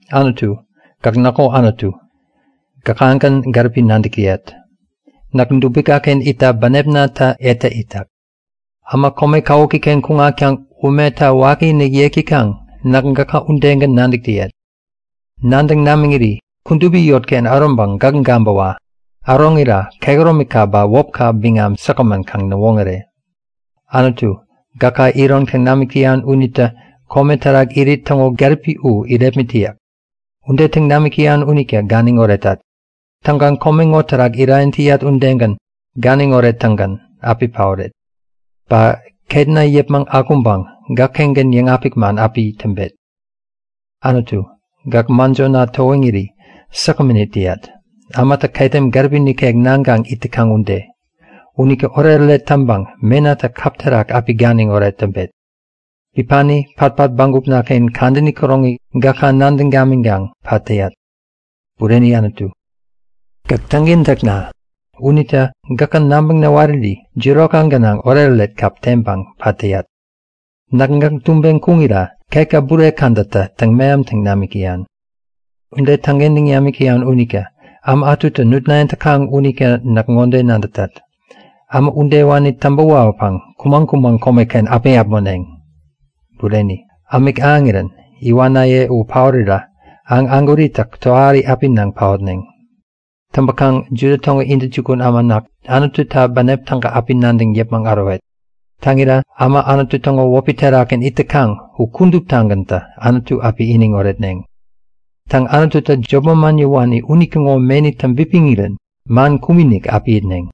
Anutu, gäk näkŋo Anutu. Gäkagän gäripi nadäk täyat. Näk dubikaken itta bänepnatä etä itak. Äma kome kawukiken kuŋatkaŋ umeta wakiinik yek täkaŋ, näk gäka udegän nadäk täyat. Nadäŋ namiŋiri kudupi yotken äroŋpäŋ gäk gabäwa! Äroŋira kehäromika ba wäpka biŋam säkgämän kaŋ näwoŋäre! Anutu, gäkä iron täŋ namik täyan unitä kome terak irit täŋo gäripi u irepmit täyak. Ude täŋ namik täyan unita ganiŋ oretat. Täŋkaŋ kome ŋo terak irayäŋ täyat udegän ganiŋ orettäŋgän api paoret. Ba ketna yäpmäŋ akuŋpäŋ gäkkengän yäŋapik man api yäk täŋpet. Anutu, gäk mäjona towiŋiri säkgämän it täyat, ämatä ketem gäripi nikek naŋkaŋ it täkaŋ ude. Unita oretoret täŋpäŋ menatä kap terak api ganiŋoret täŋpet. Bipani, patpat bägupnaken kadäni käroŋi gäka nadäŋ gamiŋkaŋ pat täyat. Bureni Anutu, gäk täŋkentäkna. Unita gäkä nabäŋ näwariri jirokka gänaŋ oretoret kap teŋpäŋ pat täyat. Näk gäk tubeŋ kuŋira ketka bure kädatä täŋ-mehamtaŋ namik täyan. Ude täŋkentäŋ namik täyan unita äma ätutä nutnayäŋ täkaŋ unita näk ŋode nadätat; Äma udewani täŋpä wawäpäŋ kumäŋ-kumäŋ komeken api äpmoneŋ! Bureni, ämik ahäŋirän iwanaye u paorirä aŋ ägwäritä tohari api naŋ paotneŋ. Täŋpäkaŋ Juda täŋo intäjukun äma näk, Anututa bänep täga api nadäŋ yäpmäŋ ärowet. Täŋira äma Anutu täŋo wäpi terakgän it täkaŋ, u kuduptagäntä Anutu api iniŋ oretneŋ. Täŋ Anututä jop manman yäwani unitäŋo meni täŋpipiŋirän mankum-inik api itneŋ.